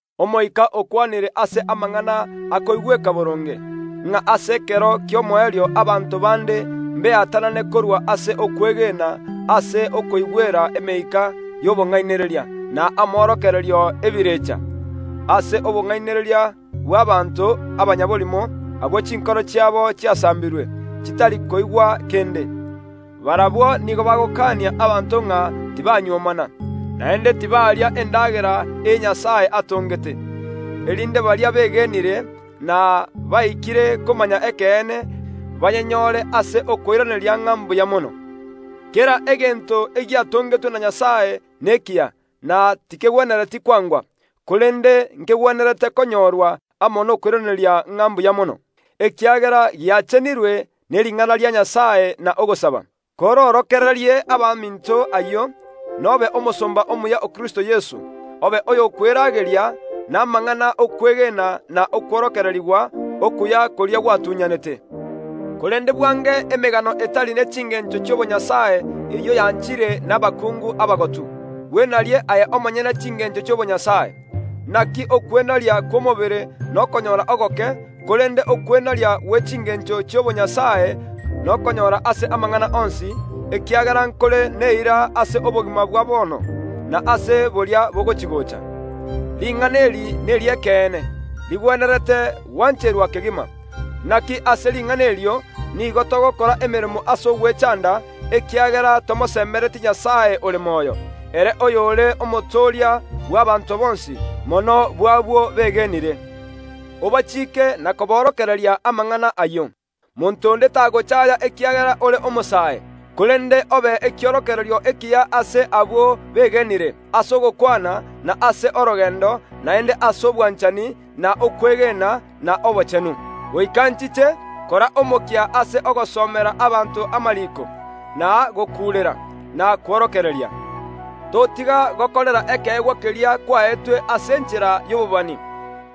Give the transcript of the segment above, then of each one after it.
Omoika okwanire ase amang’ana akoigweka boronge, ng’a ase ekero ki’omoerio abanto bande mbeatanane korwa ase okwegena ase okoigwera emeika y’obong’ainereria na amorokererio y’ebirecha, ase obong’ainereria bw’abaanto abanyaborimo, abwo chinkoro chiabo chiasambirwe, chitari koigwa kende. Barabwo nigo bagokaania abanto ng’a tibanyuomana, naende tibaria endagera eye Nyasae atongete, erinde baria begenire, na baikire komanya ekeene, bayenyore ase okoiraneria ng’a mbuya mono. Kera egento egiatongetwe na Nyasae nekiya na tikegwenereti kwangwa, korende, nkegwenerete konyorwa amo nokoiraneria ng’a mbuya mono, ekiagera giachenirwe ne ring’ana ria Nyasae na ogosaba. Koroorokererie abaminto ayio, nobe omosomba omuya o Kristo Yeso, obe oyokwerageria namang’ana y’okwegena na okworokererigwa okuya koria gwatunyanete. Korende bwange emegano etari ne chingencho chi’obonyasae eyio yanchire nabakungu abagotu. Bwenarie aye omonyene chingeencho chi’obonyasae. Inaki okwenaria kw’omobere nokonyora ogoke, korende okwenaria gwe chingencho chi’obonyasae nokonyora ase amang’ana onsi, ekiagera nkore neira ase obogima bwa bono, na ase boria bogochia‐gocha. Ring’ana eri neri’ekeene, rigwenerete gwancherwa kegima. Inaki ase ring’ana erio nigo togokora emeremo ase ogwechaanda, ekiagera tomoseemeretie Nyasae ore moyo, ere oyore Omotooria bw’abaanto bonsi, mono abwo begenire. Obachiike na koboorokereria amang’ana ayio. Monto onde tagochaaya ekiagera ore omosae, korende obe ekiorokererio ekiya ase abwo begenire, ase ogokwana, na ase orogeendo, naende ase obwanchani, na okwegena, na obochenu. Goika nchiche, kora omokia ase ogosomera abanto amariiko, na gokuurera, na kworokereria. Totiga gokorera ekeegwa keria kwaetwe ase enchera y’obobani,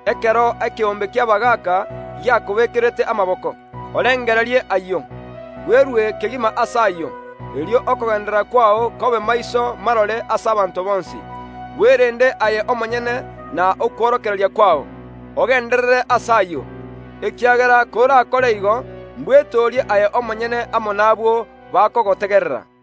ekero ekeombe ki’abagaaka giakobeekerete amaboko. Orengererie ayio, bwerue kegima ase ayio, erio okogeenderera kwao kobe maiso marore ase abanto bonsi. Bwerende aye omonyene na okworokereria kwao, ogeenderere ase ayio, ekiagera korakore igo mbwetoorie aye omonyene amo n’abwo bakogotegerera.